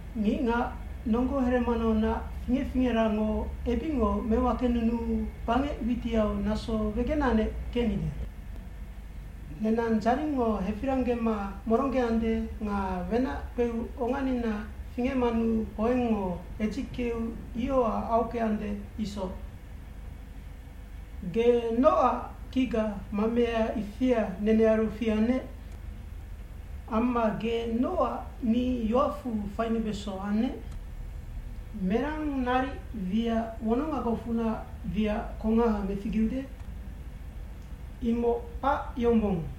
Ngicngac nonggo heremanaunac fingec fingerango ebicngo mewakenunuu bangec witiau naso wegenanec kecnide. Nenang dzaringngo hefiranggema moronggeande nga wenac kpeu onganina fingecmanu hoengngo hedzickeu ioha aockeande isoc. Ge nocac kicga mamea ifia nenearu fiannec? Amma ge nocac ni yoacfu fainubeso annec? Merang naric wiac wonongagocfunac wiac kongaha meficgeude? Imoc kpac yombong!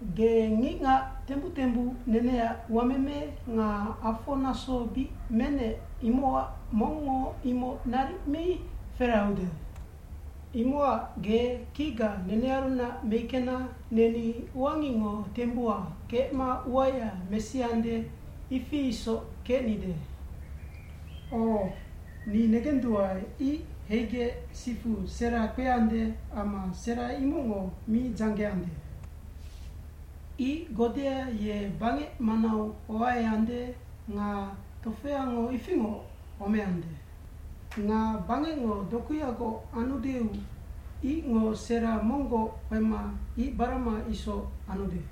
Ge ngicngac tembuc tembuc neneac uameme nga afo naso bic menec imocac mongngo imoc naric mi ferahaude. Imocac ge kicga nenearunac meickena neni uangicngo tembuha kecma uaya mesiande, ifi isoc kecnide. O, ni negenduae ic heigec sifu sera kpeande amma sera imocngo mi dzanggeande. Ic godea ye bangec manau hoaeande nga tofeango ifingoc homeande. Nga bangecngo dokuyagoc anudeu icngo sera monggoc kpema ic barama isoc anude.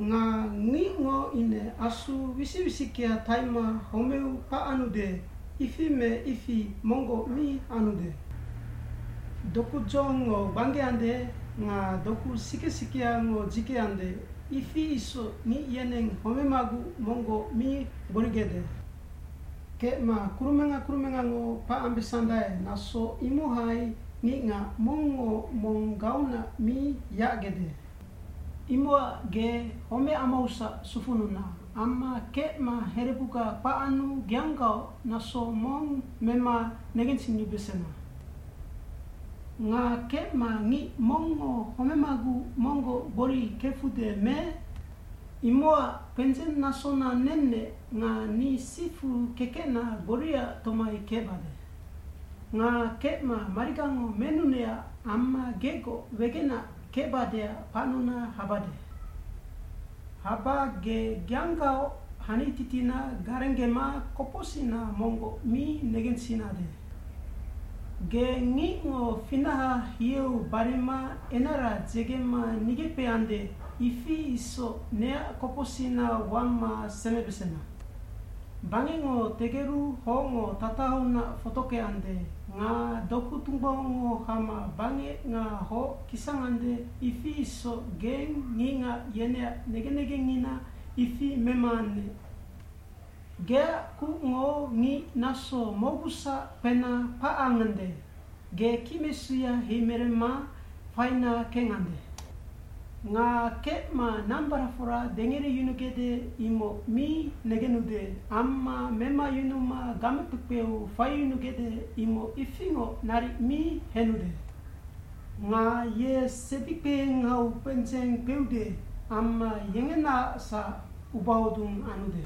Nga ngicngo ine asu wisic wisickea taima homeu kpacanude, ifi me ifi monggoc mi anude. Doku dzohongngo gbanggeande nga doku sike sikeango dzikeande, ifi isoc ngic yeneng homemaguc monggoc mi gborigecde. Kecma kurumenga kurumengango kpacambesandae naso imohai ngicngac mongngo mong gaunac mi yacgede. Imocac ge homec amausac sufununa, amma kecma herebuga kpacanu geanggaoc naso mong mema negensinubesena. Nga kecma ngic mongngo homemaguc monggoc gbori kecfude me? Imocac kpendzeng nasona nennec nga ni sifu kekecna gboriaac tomai kecbade. Nga kecma marigango menunecac amma gegoc wegenac kecbadeac kpacnuna habade. Haba ge geanggaoc hani titina garenggema kopocsicna monggoc mi negensinade. Ge ngicngo finaha hieu barima enara dzegema nigeckpeande ifi isoc neac kopocsicna wama semebesena. Bangecngo tegeru hocngo tatahaunac fotockeande, nga doku tunggbaungngo hama bangec nga hoc kisangande ifi isoc geng ngicngac yeneac negen negengina ifi memaannec. Geac kucngo ngic naso mocgusac kpena kpacangande, ge kicmesuya heimeremma faina kengande. Nga kecma nambaracfora dengere yunugecde imoc mi negenude amma memayunuma gamekpekpeu faiyunugecde imoc ifingoc naric mi henude. Nga ye sebikpehengau kpendzeng kpeude amma yengenaacsac ubahodung anude.